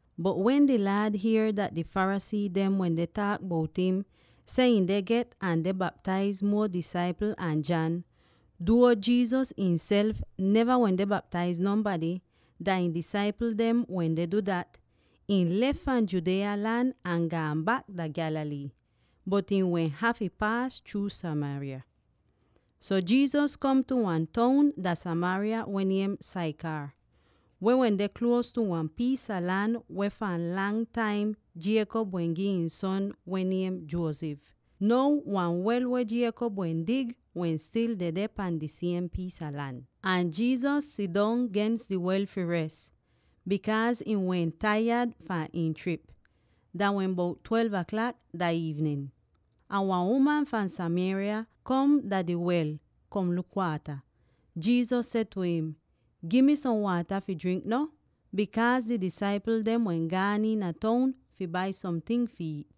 Bot, wen di Laad hier dat di Pharisee dem wende taak bout im seh ihn deh get ahn deh baptaiz muo disaipl an John —duo Jesus ihnself neva wende baptaiz nonbady; dah ihn disaipl dem wende du dat— ihn lef fahn Judea lan ahn gaan bak dah Galilee. Bot ihn wehn hafy paas chruu Samaria. So Jesus kom tu wan toun dah Samaria weh niem Sychar, weh wende nier tu wan piis a lan weh fahn lang taim Jacob wehn gi ihn son weh niem Joseph. Now, wan wel weh Jacob wehn dig wehn stil dedeh pahn di siem piis a lan. Ahn Jesus sidong gens di wel fi res, bikaaz ihn wehn taiyad fahn ihn trip. Dah wehn bout twelve aklak dah iivnin. Ahn wan uman fahn Samaria kom dah di wel, kom luk waata. Jesus seh tu im, “Gi mi som waata fi jrink no.” (Bikaaz di disaipl dem wehn gaan iina toun fi bai somting fi iit.)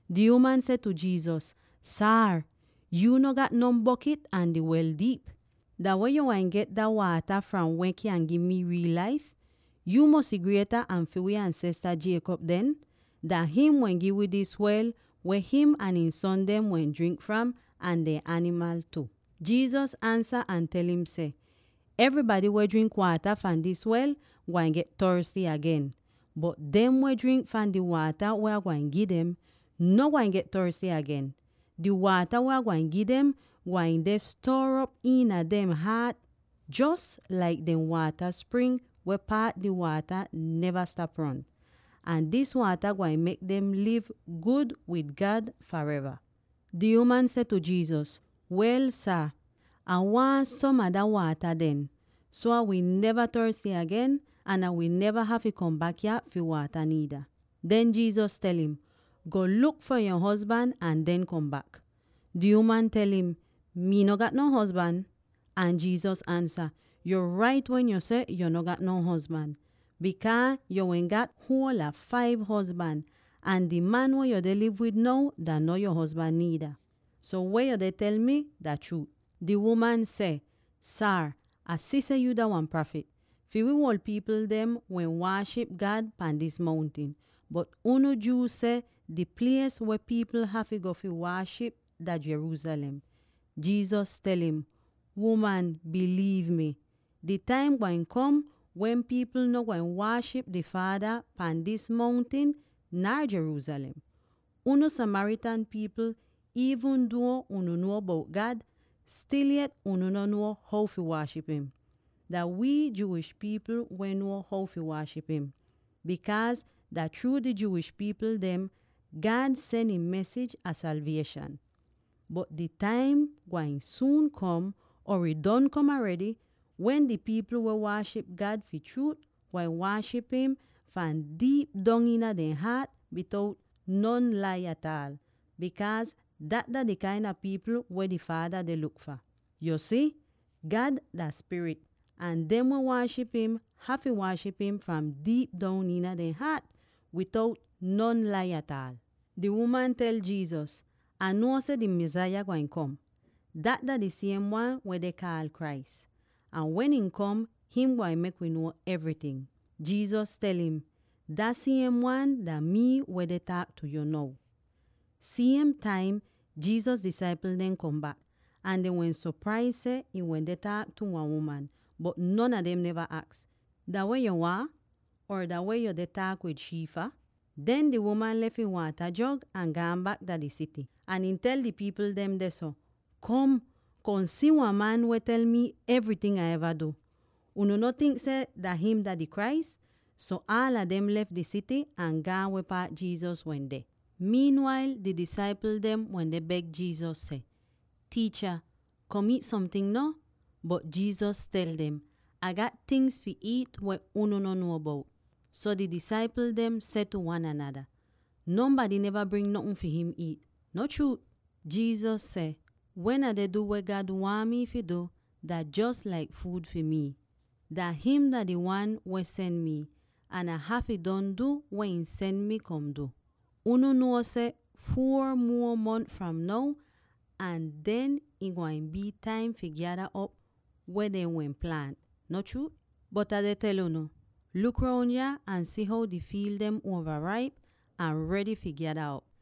Di uman seh tu Jesus, “Saar, yuu no gat non bokit ahn di wel diip. Dah weh yu gwain get dat waata fram weh kyan gi mi riil laif? Yu mosy grieta an fi wii ansesta Jacob den? Dah him weh gi wi dis wel, weh him ahn ihn son dem wehn jrink fram, ahn dehn animal tu.” Jesus ansa ahn tel im seh, “Evrybady weh jrink waata fahn dis wel gwain get torsty agen. Bot dem weh jrink fahn di waata weh Ah gwain gi dem, no gwain get torsty agen. Di waata weh Ah gwain gi dem gwain deh stuor op iina dehn haat jos laik dem waata spring weh paat di waata neva stap ron. Ahn dis waata gwain mek dem liv gud wid God fareva.” Di uman seh tu Jesus, “Wel sah, Ah waahn som a dah waata den, so Ah wi neva torsty agen, ahn Ah wi neva hafy kom bak yah fi waata niida.” Den Jesus tel im, “Go luk fi yo hozban ahn den kom bak.” Di uman tel im, “Mii no gat non hozban.” Ahn Jesus ansa, “Yo rait wen yo seh yo no gat non hozban; bikaaz yo wehn gat huol a five hozban, ahn di man weh yo deh liv wid now dah no yo hozban niida. So weh yo deh tel mi dah chruut!” Di uman seh, “Saar, Ah si seh yuu dah wan prafit. Fi wi uol pipl dem wehn waaship God pahn dis mountin, bot unu Jew seh di plies weh pipl hafy go fi waaship dah Jerusalem.” Jesus tel im, “Uman, biliiv mi, di taim gwain kom wen pipl no gwain waaship di Faada pahn dis mountin nar Jerusalem. Unu Samaritan pipl, iivn duo unu nuo bout God, stil yet unu no nuo how fi waaship im; dah wii Jewish pipl weh nuo how fi waaship im, bikaaz dah chruu di Jewish pipl dem God sen ihn mesij a salvieshan. Bot di taim gwain suun kom —or ih don kom aredy— wen di pipl weh waaship God fi chruut gwain waaship im fahn diip dong iina dehn haat bitout non lai ataal, bikaaz dat dah di kain a pipl weh di Faada deh luk fah. Yu si, God dah spirit, ahn dem weh waaship im hafy waaship im fahn diip dong iina dehn haat bitout non lai ataal.” Di uman tel Jesus, “Ah nuo seh di Mesaya gwain kom. (Dat dah di siem wan weh dehn kaal Christ.) Ahn wen im kom, him gwain mek wi nuo evryting.” Jesus tel im, “Dah siem wan dah mii weh deh taak tu yu now.” Siem taim, Jesus disaipl dem kom bak, ahn dehn wehn sopraiz seh ihn wende taak tu wan uman, bot non a dem neva aks, “Dah weh yuu waahn?” or “Dah weh yuu deh taak tu shii fah?” Den di uman lef ihn waata jog ahn gaan bak dah di sity. Ahn ihn tel di pipl dem dehso, “Kom, kom si wan man weh tel mi evryting Ah eva du! Unu no tink seh dah him dah di Christ?” So aala dem lef di sity ahn gaan weh paat Jesus wende. Wail dah taim kom, di disaipl dem wende beg Jesus seh, “Tiicha, kom iit somting no.” Bot Jesus tel dem, “Ah gat tingz fi iit weh unu no nuo bout.” So di disaipl dem seh tu wan anada, “Nonbady neva bring notn fi him iit, no chruu?” Jesus seh, “Wen Ah deh du weh God waahn mi fi du, dah jos laik fuud fi mii. Dah him dah di Wan weh sen mii, ahn Ah hafy don du weh ihn sen mi kom du. Unu nuo seh, ‘Four muo mons fram now ahn den ih gwain bii taim fi gyada op weh dehn wehn plaant,’ no chruut? Bot Ah deh tel unu: luk roun yah ahn si how di fiil dem uova raip ahn redy fi gyada op!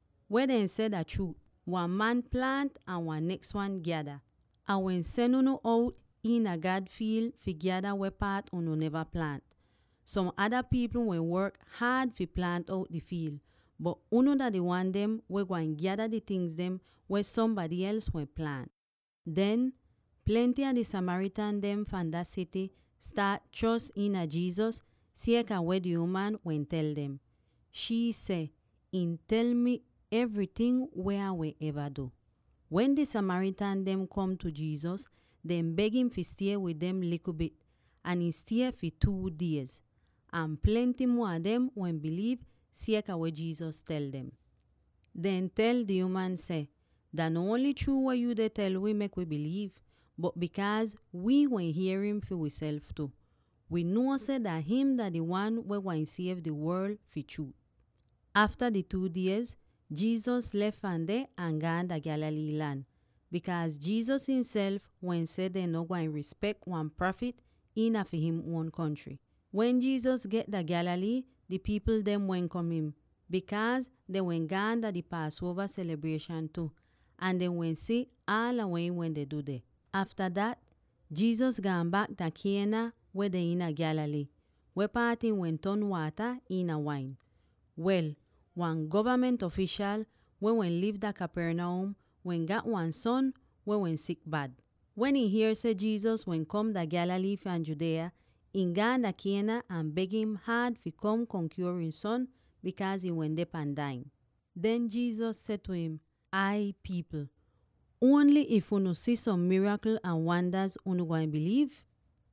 Weh dehn seh dah chruut: ‘Wan man plaant, ahn wan neks wan gyada.’ Ah wehn sen unu out iina God fiil fi gyada weh paat unu neva plaant. Som ada pipl wehn work haad fi plaant out di fiil, bot unu dah di wan dem weh gwain gyada di tingz dem weh sombady els wehn plaant.” Den, plenty a di Samaritan dem fahn dah sity staat chros iina Jesus sieka weh di uman wehn tel dem. Shii seh, “Ihn tel mi evryting weh Ah wehn eva du!” Wen di Samaritan dem kom tu Jesus, dehn beg im fi stie wid dem likl bit, ahn ihn stie fi two diez. Ahn plenty muo a dem wehn biliiv sieka weh Jesus tel dem. Dehn tel di uman seh, “Dah no ongl chruu weh yuu deh tel wi, mek wi biliiv; bot bikaaz wi wehn hier im fi wiself tu, wii nuo seh dah him dah di Wan weh gwain siev di worl fi chruut.” Afta di two diez, Jesus lef fahn deh ahn gaan dah Galilee lan, bikaaz Jesus ihnself wehn seh dehn no gwain rispek wan prafit iina fi him uon kontry. Wen Jesus get dah Galilee, di pipl dem welkom im, bikaaz dehn wehn gaan dah di Paasuova selibrieshan tu, ahn dehn wehn si aala weh ihn wende du deh. Afta dat, Jesus gaan bak dah Cana weh deh iina Galilee, weh paat ihn wehn ton waata iina wain. Wel, wan govament ofishal, weh wehn liv dah Capernaum, wehn gat wan son weh wehn sik bad. Wen ihn hier seh Jesus wehn kom dah Galilee fahn Judea, ihn gaan dah Cana ahn beg im haad fi kom, kom kyuor ihn son, bikaaz ihn wende pan dai'in. Den Jesus seh tu im, “Ay, pipl! Ongl if unu si som mirakl ahn wandaz unu gwain biliiv?”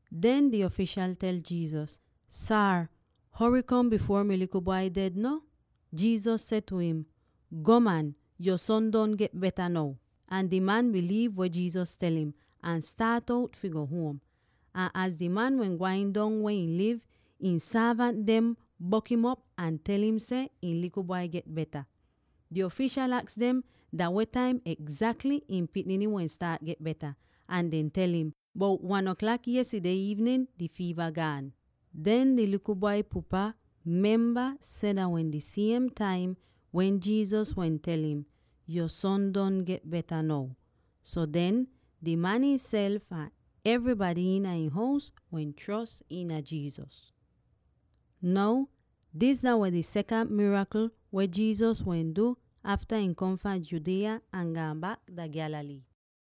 Den di ofishal tel Jesus, “Saar, hory kom bifuor mi likl bwai ded no.” Jesus seh tu im, “Gwaan man, yo son don get beta now.” Ahn di man biliiv weh Jesus tel im, ahn staat out fi go huom. Ahn az di man wehn gwain dong weh ihn liv, ihn sorvant dem bok'im op ahn tel im seh ihn likl bwai get beta. Di ofishal aks dem dah weh taim egzakly ihn pikniny wehn staat get beta, ahn dehn tel im, “Bout one aklak yestideh iivnin di fiiva gaan.” Den di likl bwai pupa memba seh dah wehn di siem taim wen Jesus wehn tel im, “Yo son don get beta now.” So den, di man ihnself ahn evrybady iina ihn hous wehn chros iina Jesus. Now dis dah wehn di sekant mirakl weh Jesus wehn du afta ihn kom fahn Judea ahn gaan bak dah Galilee.